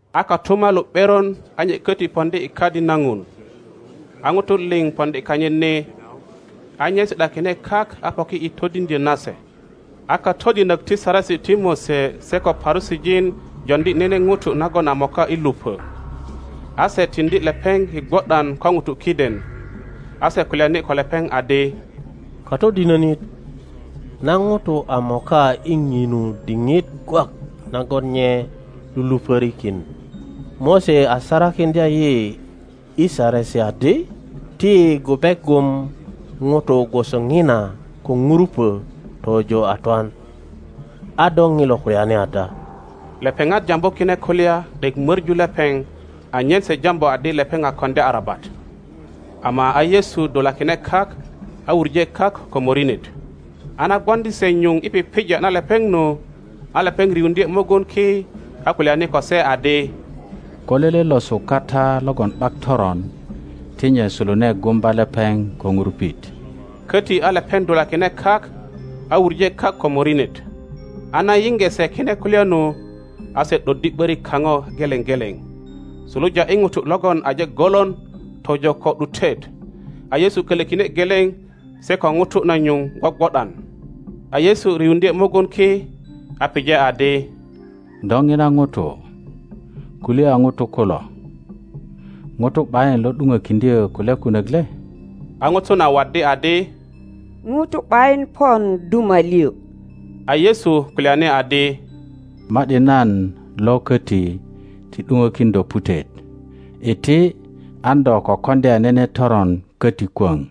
A kotumalu ’beron a nye köti poŋdi i Kadi na Ŋun. A ŋutu liŋ poŋdi kanyit ni; a nye si ’dakine kak a poki i todiŋdyö na se. A katodinök ti Saresi ti Mose se ko Parusijin joŋdi nene ŋuto nagon a moka i lupö. A se tiŋdi lepeŋ i gwo ’dan ko ŋutu kiden, a se kulyani ko lepeŋ adi, Katodinönit, na ŋuto a moka i ŋinu diŋit gwak nagon nye lulupörikin. Mose a sarakiŋdya yi i Saresi adi, ti yi gube gum ŋuto gwoso ŋina ko ŋurupö tojo a twan. A do ŋilo kulyani ada? Lepeŋat jambu kine kulya ’dek möŋu lepeŋ anyen se jambu adi lepeŋ a koŋdya arabat. Ama a Yesu dulakine kak a wuŋe kak ko morinet. A na gwoŋdi se nyuŋ i pipija na lepeŋ nu, a lepeŋ riuŋdye mugun ki, a kulyani ko se adi, Ko lele losu kata logon ’bak toron ti nye sulune gumba lepeŋ ko ŋurupit. Köti a lepeŋ dulakine kak a wuŋe kak ko morinet. A na yiŋge se kine kulya nu, a se ’doddi ’börik kaŋo geleŋ geleŋ, suluja i ŋuto logon aje golon tojo ko ’dutet, a Yesu kölökine geleŋ se ko ŋuto na nyuŋ gwogwo ’dan. A Yesu riuŋdye mugun ki, a pije adi, Do ŋina ŋuto, kuliya ŋutu kulo? Ŋuto ’bayin lo ’duŋökiŋdyö kulya kunök le? A ŋuto na waddi adi, Ŋuto ’bayin pon duma liŋ. A Yesu kulyani adi, Ma ’di nan lo köti ti ’duŋökin do putet. Iti, an do ko koŋdya nene toron köti kwöŋ.]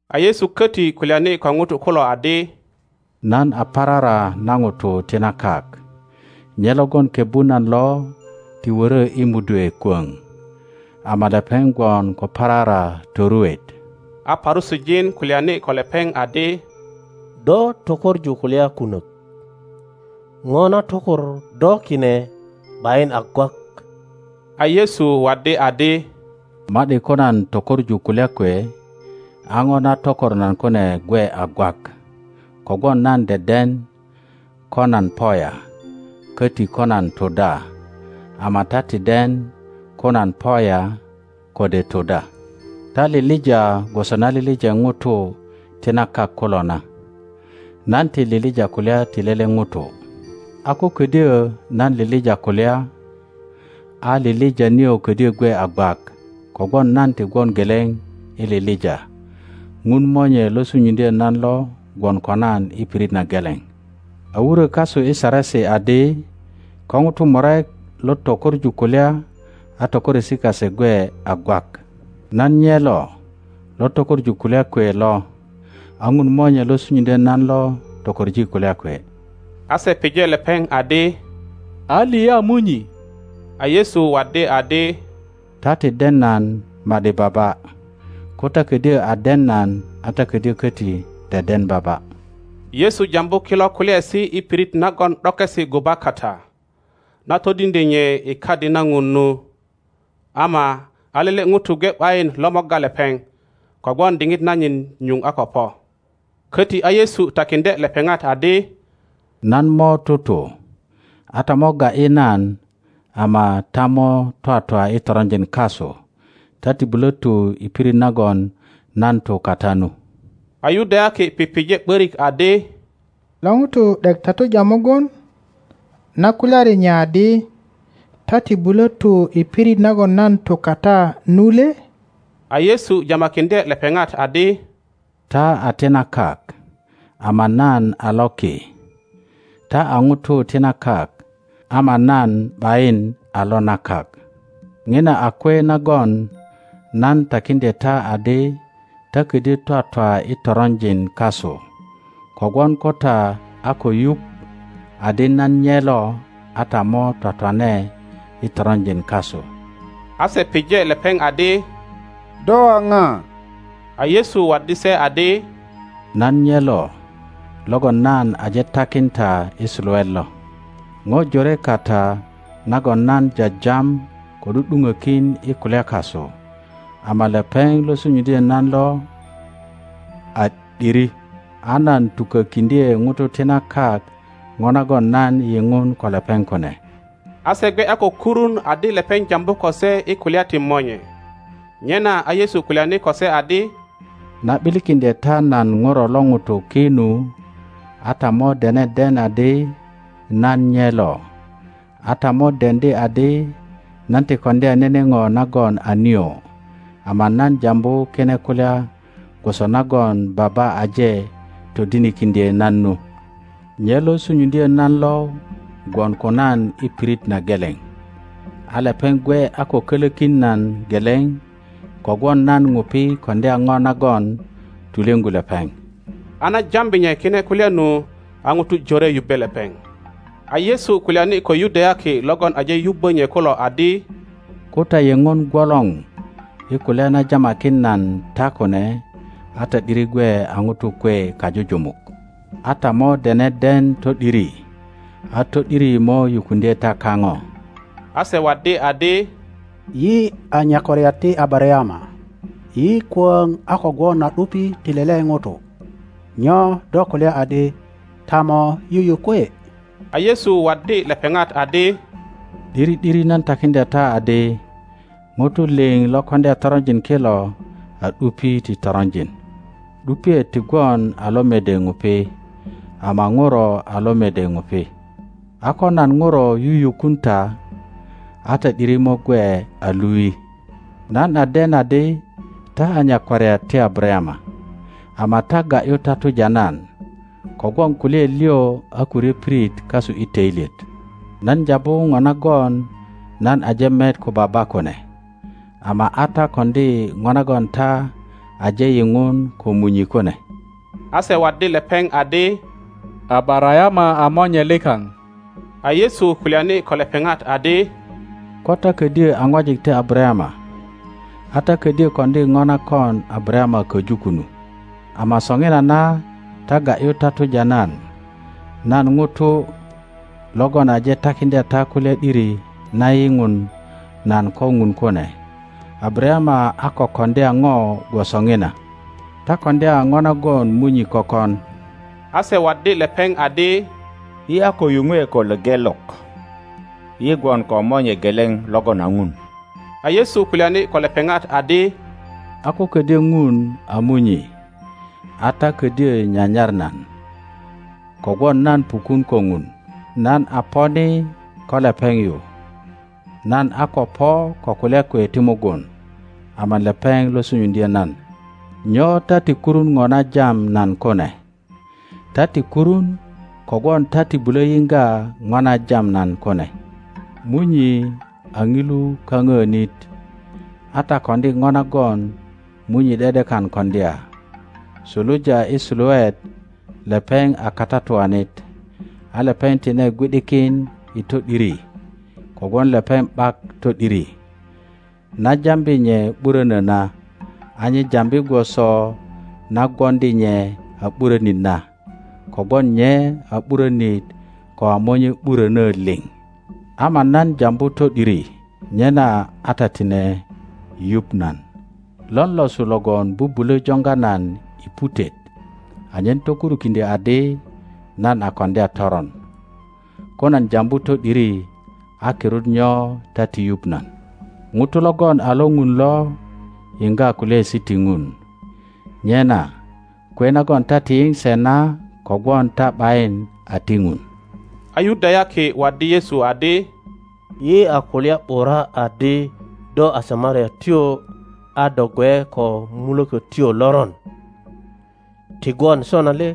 A Yesu köti kulyani ko ŋutu kulo adi, Nan a parara na ŋutu ti na kak. Nye logon kebbu nan lo ti wörö i mudwe kwöŋ, ama lepeŋ gwon ko parara toruet. A Parusijin kulyani ko lepeŋ adi, Do tökoŋu kulya kunök. ŋo na tokor do kine ’bayin a gwak. A Yesu waddi adi, Ma ’di ko nan tökoŋu kulya kwe, a ŋo na tokor nan kune gwe a gwak, kogwon nan deden ko nan po ya, köti ko nan tu da; ama ta ti den ko nan po ya kode tu da. Ta lilija gwoso na lilije ŋutu ti na kak kulo na; nan ti lilija kulya ti lele ŋuto. A ko ködyö nan lilija kulya, a lilija nio ködyö gwe a gwak, kogwon nan ti gwon geleŋ i lilija. Ŋun Monye lo sunyuŋdyö nan lo gwon ko nan i pirit na geleŋ. A wurö kasu i Saresi adi, Ko ŋutu murek lo tökoŋu kulya a tökoresi kase gwe a gwak. Nan nye lo lo tökoŋu kulya kwe lo, a Ŋun Monye lo sunyuŋdyö nan lo tokoŋ kulya kwe. A se pije lepeŋ adi, A liya Munyi? A Yesu waddi adi, Ta ti den nan ma ’di Baba. Ko ta ködyö a den nan, a ta ködyö köti deden Baba. Yesu jambu kilo kulyaesi i pirit nagon ’dokesi guba kata, na todiŋdye nye i Kadi na Ŋun nu, ama a lele ŋuto gwe ’bayin lo morga lepeŋ, kogwon diŋit nanyit nyuŋ a ko po. Köti a Yesu takiŋdye lepeŋat adi, Nan mo tutu, a ta mo ga ’yi nan, ama ta mo twatwa i toronjin kasu. Ta ti bulö tu i pirit nagon nan tu kata nu. A Yudayaki pije ’börik adi, Lo ŋuto ’dek tatuja mugun, na kulyari nye adi, Ta ti bulö tu i pirit nagon nan tu kata nu le? a Yesu jamakiŋdye lepeŋat adi, Ta a ti na kak, ama nan a lo ki. Ta a ŋutu ti na kak, ama nan ’bayin a lo na kak. ŋina a kwe nagon nan takiŋdye ta adi ta ködyö twatwa i toronjin kasu; kogwon ko ta a ko yuŋ adi nan nye lo, a ta mo twatwane i toronjin kasu. A se pije lepeŋ adi, Do a ŋa? A Yesu waddi se adi, Nan nye lo logon nan aje takin ta i suluet lo. jore kata nagon nan jajam ko ’du ’duŋökin i kulya kasu. Ama lepeŋ lo sunyuŋdyö nan lo a ’diri, a nan tukökiŋdye ŋutu ti na kak ŋo nagon nan yiŋun ko lepeŋ kune. A se gwe a ko kurun adi lepeŋ jambu ko se i kulya ti Monye. Nyena a Yesu kulyani ko se adi, Na ’bilikindye ta nan Ŋuro lo ŋuto ki nu, a ta mo dene den adi nan nye lo, a ta mo deŋdi adi nan ti koŋdya nene ŋo nagon a nio, ama nan jambu kine kulya gwoso nagon Baba aje todinikiŋdye nan nu. Nye lo sunyuŋdyö nan lo gwon ko nan i pirit na geleŋ. A lepeŋ gwe a ko kolökin nan geleŋ, kogwon nan ŋupi koŋdya ŋo nagon tulyöŋgu lepeŋ. A na jambi nye kine kulya nu, a ŋutu jore yubbe lepeŋ. A Yesu kulyani ko Yudayaki logon aje yubbö nye kulo adi, Ko ta yeŋon gwolor i kulya na jamakin nan ta kune, a ta ’diri gwe a ŋutu kwe kajujumuk, a ta mo dene den to ’diri, a to ’diri mo yukuŋdye ta kaŋo. a se waddi adi, Yi a nyakwariat ti Abarayama, yi kwöŋ a ko gwon a ’dupi ti lele ŋuto. Nyo do kulya adi, Ta mo yuyukwe? A Yesu waddi lepeŋat adi, ’Diri ’diri nan takiŋdya ta adi, ŋutu liŋ lo koŋdya toronjin kilo a ’dupi ti toronjin. ’Dupiet ti gwon a lo mede ŋupi, ama ŋuro a lo mede ŋupi. A ko nan Ŋuro yuyukun ta, a ta ’diri mo gwe a lui. Nan a den adi ta a nyakwariat ti Abarayama; ama ta ga ’yu tatuja nan, kogwon kulyaet liŋ a ko ryö pirit kasu i töilyet. Nan jambu ŋo nagon nan aje met ko Baba kune; ama a ta koŋdi ŋo nagon ta aje yiŋun ko munyi kune. A se waddi lepeŋ adi, Abarayama a monye likaŋ. A Yesu kulyani ko lepeŋat adi, Ko ta ködyö a ŋwajik ti Abarayama, a ta ködyö koŋdi ŋo na kon Abarayama köju kunu. Ama soŋinana ta ga ’yu tatuja nan, nan ŋuto logon aje takiŋdya ta kulya ’diri na yiŋun nan ko Ŋun kune. Abarayama a ko koŋdya ŋo gwoso ŋina. Ta koŋdya ŋo nagon munyi kökon. A se waddi lepeŋ adi, Yi a ko yuŋwe ko lepelok; yi gwon ko Monye geleŋ logon a Ŋun. a Yesu kulyani ko lepeŋat adi, A ko ködyö Ŋun a Munyi, a ta ködyö nyanyar nan, kogwon nan pukun ko Ŋun, nan a po ni ko lepeŋ yu. Nan a ko po ko kulya kwe ti mugun, ama lepeŋ lo sunyuŋdyö nan. Nyo ta ti kurun ŋo na jam nan kune? Ta ti kurun kogwon ta ti bulö yiŋga ŋo na jam nan kune. Munyi a ŋilu kaŋöönit, a ta koŋdi ŋo nagon munyi ’de ’dekan koŋdya. Suluja i suluet lepeŋ a katatuanit, a lepeŋ tine gwi ’dikin i to ’diri, kogwon lepeŋ ’bak to ’diri. Na jambi nye ’burönö na, a nye jambi gwoso na gwoŋdi nye a ’burönit na, kogwon nye a ’burönit ko a monye ’burönö liŋ. Ama nan jambu to ’diri, nyena a ta tine yuŋ nan. Lon losu logon bubulö joŋga nan i putet anyen tokurukiŋdyö adi nan a koŋdya toron? Ko nan jambu to ’diri a kirut nyo ta ti yuŋ nan? Ŋuto logon a lo Ŋun lo yiŋga kulyaesi ti Ŋun; nyena kwe nagon ta ti yiŋ se na kogwon ta ’bayin a ti Ŋun. A Yudayaki waddi Yesu adi, Yi a kulya ’bura adi do a Samariatyo a do gwe ko mulökötyo loron, ti gwon sona le?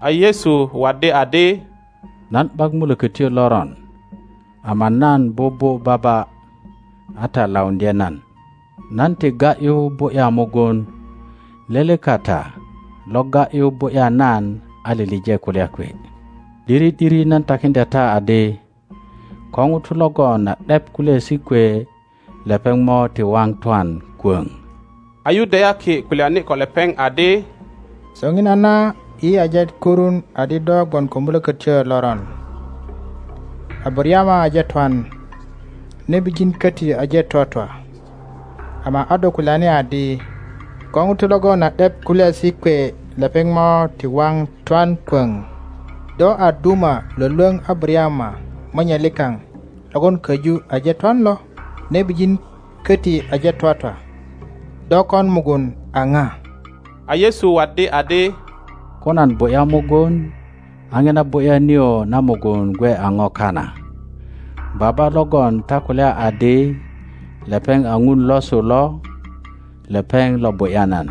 A Yesu waddi adi, Nan ’bak mulökötyo loron, ama nan bubu Baba, a ta lauŋdye nan. Nan ti ga ’yu bu ’ya mugun; lele kata lo ga ’yu bu ’ya nan a lilije kulya kwe. ’Diri ’diri nan takiŋdya ta adi, ko ŋuto logon a ’dep kulyaesi kwe lepeŋ mo ti waŋ twan kwöŋ. A Yudayaki kulyani ko lepeŋ adi, Soŋinana yi aje kurun adi do gwon ko mulökötyo loron. Abarayama aje twan, nebijin köti aje twatwa, ama a do kulyani adi, Ko ŋuto logon a ’dep kulyaesi kwe lepeŋ mo ti waŋ twan kwöŋ. Do a duma lwölwöŋ Abarayama monye likaŋ logon köju aje twan lo? Nebijin köti aje twatwa. Do kon mugun a ŋa? a Yesu waddi adi, Ko nan bu ’ya mugun, a ŋina bu ’ya nio na mugun gwe a ŋo kana. Baba logon ta kulya adi lepeŋ a Ŋun losu lo, lepeŋ lo bu ’ya nan.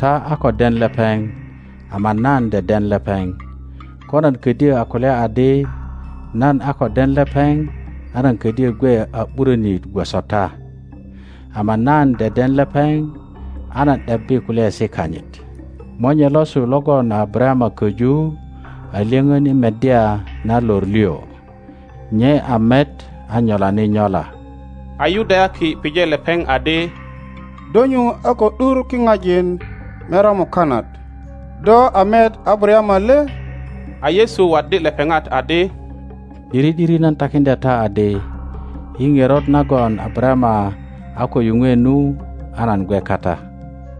Ta a ko den lepeŋ, ama nan deden lepeŋ; ko nan ködyö a kulya adi nan a ko den lepeŋ a nan ködyö gwe a ’burönit gwoso ta, ama nan deden lepeŋ a nan ’debbi kulyaesi kanyit. Monye losu logon a Abarayama köju a lyöŋön i meddya na lor liŋ; nye a met a nyolani nyola. a Yudayaki pije lepeŋ adi, Do nyuŋ a ko ’dur kiŋajin merya mukanat, do a met Abarayama le? A Yesu waddi lepeŋat adi, ’Diri ’diri nan takindya ta adi, I ŋerot nagon Abarayama a ko yuŋwe nu, a nan gwe kata.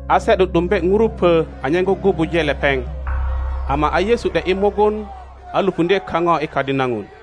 A se ’du ’dumbe ŋurupö anyen gugubuje lepeŋ, ama a Yesu ’de ’yi mugun, a lupundye kaŋo i Kadi na Ŋun.